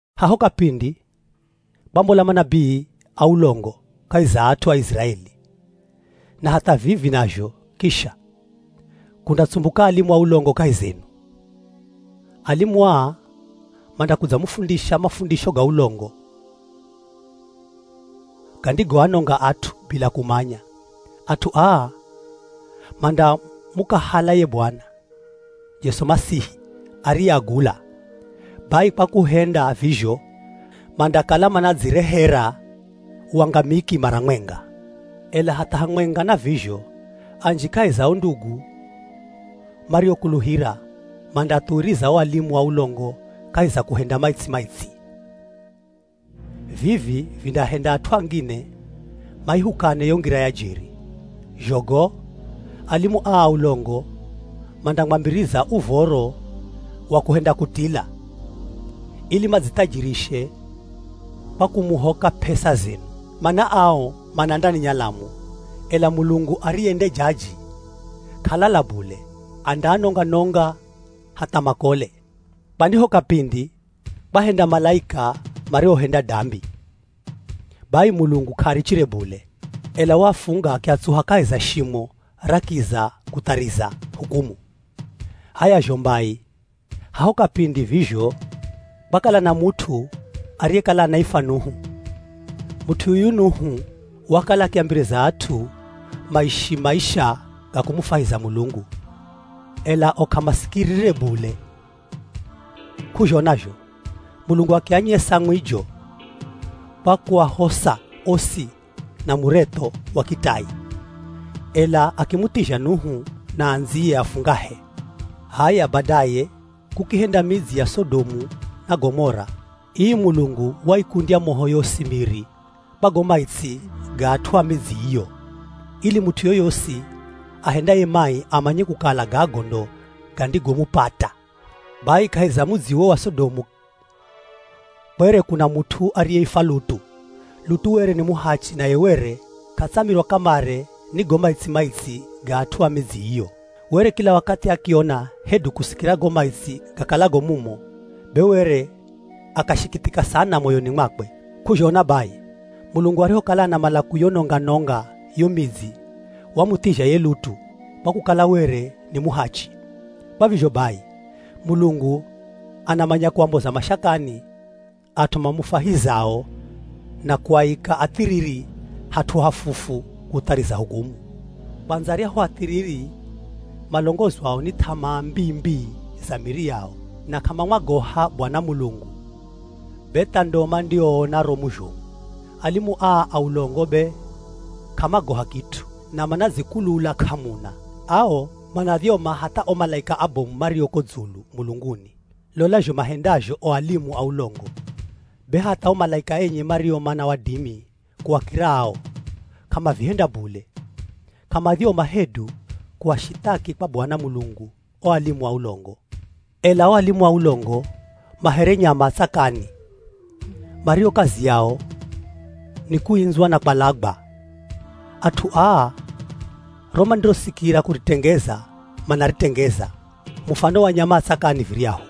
Haho kapindi kwambola manabii a ulongo kahi za at'u a Iziraeli. Na hatha vivi nazho kisha, kundatsumbuka alimu a ulongo kahi zenu. Alimu aa mandakudzamufundisha mafundisho ga ulongo gandigoanonga at'u bila kumanya. At'u aa mandamukahala ye Bwana Jesu Masihi ariyeagula. Bai kwa kuhenda vizho, mandakala manadzirehera wangamiki mara mwenga. Ela hatha hamwenga na vizho anji kahi za o ndugu mariokuluhira mandaathuwiriza o alimu a ulongo kahi za kuhenda maitsi-maitsi. Vivi vindaahenda at'u angine maihukane yo Ngira ya jeri. Zho go, alimu aa a ulongo mandamwambiriza uv̱oro wa kuhenda kutila, ili madzithajirishe kwa kumuhoka p'esa zenu. Mana ao mana ndani nyalamu. Ela Mulungu, ariye nde jaji k'alala bule, andaanonga-nonga hatha makole. Kwani ho kapindi kwahenda malaika mariohenda dambi. Bai Mulungu k'aarichire bule, ela waafunga akiatsuha kahi za shimo ra kiza kuthariza hukumu. H'aya zho mbai, haho kapindi vizho kwakala na mut'u ariyekala anaifwa Nuhu. Mut'u yuyu Nuhu wakala akiambiriza at'u maishi maisha ga kumufwahiza Mulungu, ela o k'amasikirire bule. K'uzhona zho Mulungu akianyesa mwijo kwa kuahosa osi na muretho wa kitai, ela akimuthizha Nuhu na andziye afungahe. H'aya, badaye kukihenda midzi ya Sodomu na Gomora. Ii Mulungu waikundya moho yosi miri kwa go maitsi ga at'u a midzi iyo, ili mut'u yoyosi ahendaye mai amanye kukala gago ndo gandigomupata. Bai kahi za mudzi uwo wa Sodomu kwere kuna mut'u ariyeifwa Lutu. Lutu were ni muhachi naye were k'atsamirwa kamare ni go maitsi-maitsi ga at'u a midzi iyo. Were kila wakathi akiona hedu kusikira go maitsi gakalago mumo, be were akashikithika sana moyoni mwakwe. K'uzhona bai, Mulungu arihokala anamala kuyononga-nonga yo midzi wamuthizha ye Lutu, kwa kukala were ni muhachi. Kwa vizho bai Mulungu anamanya kuamboza mashakani at'u mamufwahizao na kuaika athiriri hat'u hafufu kuthariza hukumu. Kwandza aryahu athiriri malongozwao ni th'amaa mbii-mbii za miri yao na k'amamwagoha Bwana Mulungu be tha ndo mandioona romu zhomu. Alimu aa a ulongo be k'amagoha kit'u na manadzikulula k'amuna; ao manadhyoma hatha o malaika abomu mario ko dzulu mulunguni. Lola zho mahendazho o alimu a ulongo be hatha o malaika enye mario mana wadimi kuakira ao, k'amavihenda bule, k'amadhyoma hedu kuashithaki kwa Bwana Mulungu o alimu a ulongo. Ela o alimu a ulongo ma here nyama a tsakani mario kazi yao ni kuindzwa na kwalagwa. At'u aa ro mandirosikira kuritengeza manaritengeza, mufano wa nyama a tsakani viryahu.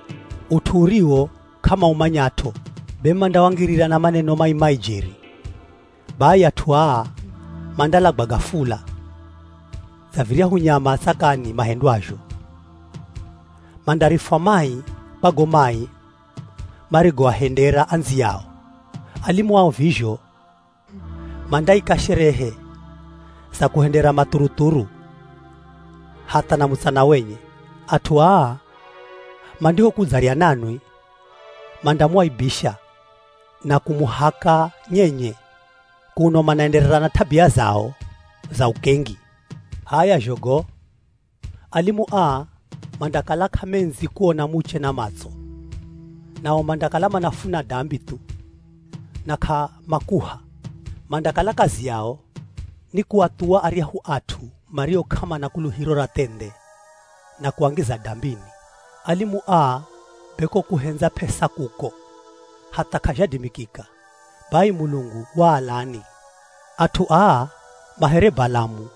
Ut'u uriwo k'amaumanyat'o, be mandawangirira na maneno mai-mai jeri. Bai at'u aa mandalagwa gafula dza viryahu nyama a tsakani mahendwazho. Mandarifwa mai kwa go mai marigoahendera andziyao. Alimu ao vizho mandaika sherehe za kuhendera mathuruthuru hatha na mutsana wenye. At'u aa mandihokudzarya nanwi, mandamuaibisha na kumuhaka nyenye, kuno manaenderera na t'abia zao za ukengi. H'aya zho go, alimu aa mandakala k'amendzi kuona muche na matso. Nao mandakala manafuna dambi thu na k'amakuha. Mandakala kazi yao ni kuathuwa aryahu at'u mario k'amana kuluhiro ra thendhe na kuangiza dambini. Alimu aa be ko kuhendza p'esa kuko, hatha k'azhadimikika. Bai Mulungu waalani. At'u aa ma here Balamu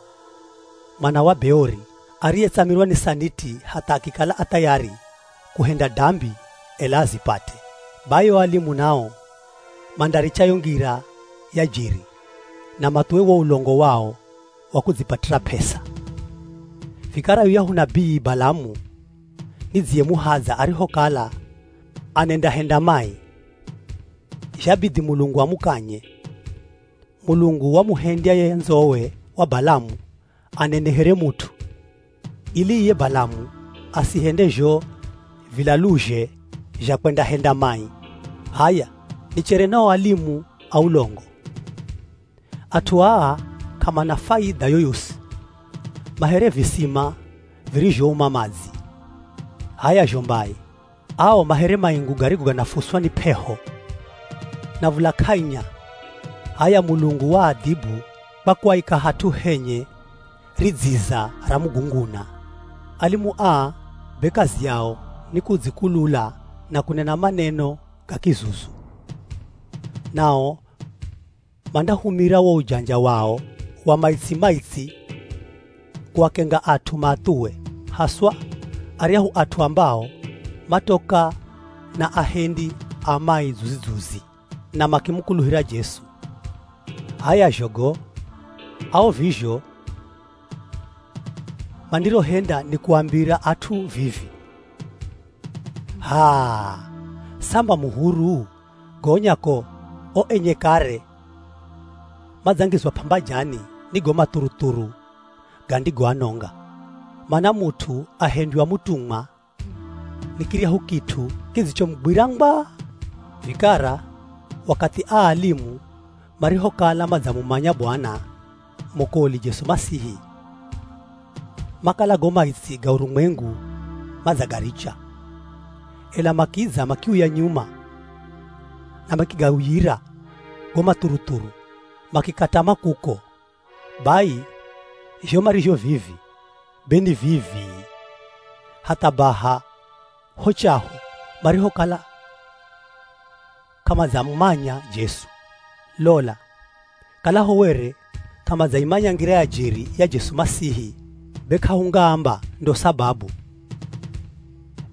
mwana wa Beori, ariyetsamirwa ni saniti hatha akikala a thayari kuhenda dambi ela azipate. Bai o alimu nao mandaricha yo ngira ya jeri na mathuwe wo ulongo wao wa kudzipatira p'esa. Vikara yuyahu nabii Balamu nidziyemuhadza arihokala anendahenda mai, zhabidhi Mulungu amukanye. Mulungu wamuhendya ye ndzowe wa Balamu anene here mut'u ili iye Balamu asihende zho vilaluzhe zha kwendahenda mai. H'aya nichere na o alimu a ulongo. At'u aa k'amana faidha yoyosi. Ma here visima virizhouma madzi. H'aya zho mbai, ao ma here maingu garigo ganafuswa ni p'eho na v̱ula k'ainya. H'aya Mulungu waadhibu kwa kuaika hat'u henye ridziza ra mugunguna. Alimu aa be kazi yao ni kudzikulula na kunena maneno ga kizuzu. Nao mandahumira wo ujanja wao wa maitsi-maitsi kuakenga at'u maathuwe, haswa aryahu at'u ambao matoka na ahendi a mai dzuzi-dzuzi na makimukuluhira Jesu. H'aya zho go, ao vizho mandirohenda ni kuambira at'u vivi, “H'aa, samba mu huru,” gonya ko o enye kare madzangizwa p'ambajani ni go mathuruthuru gandigoanonga. Mana mut'u ahendywa mutumwa ni kiryahu kit'u kidzichomugwira ngwa. Vikara wakathi aa alimu marihokala madzamumanya Bwana, mwokoli Jesu Masihi, makala go maitsi ga urumwengu madzagaricha. Ela makidza makiuya nyuma na makigauyira go mathuruthuru, makikatama kuko. Bai zho marizho vivi be ni vii-vii, hatha baha ho chaho marihokala k'amadzamumanya Jesu. Lola, kalaho were k'amadzaimanya ngira ya jeri ya Jesu Masihi, be k'ahungaamba ndo sababu,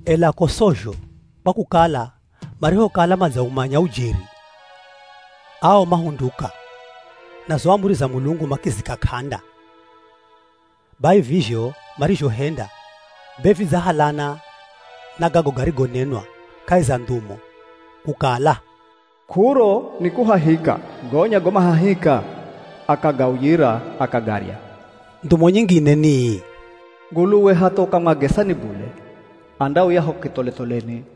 ela ko sozho. Kwa kukala marihokala madzaumanya ujeri, ao mahunduka na zo amuri za Mulungu makizika k'anda. Bai vizho marizhohenda be vidzahalana na gago garigonenwa kahi za ndhumo, kukala, “K'uro ni kuhahika gonya go mahahika akagauyira akagarya.” Ndhumo nyingine ni ii, “Nguluwe hatha ukamwagesa ni bule, andauya ho kitholetholeni.”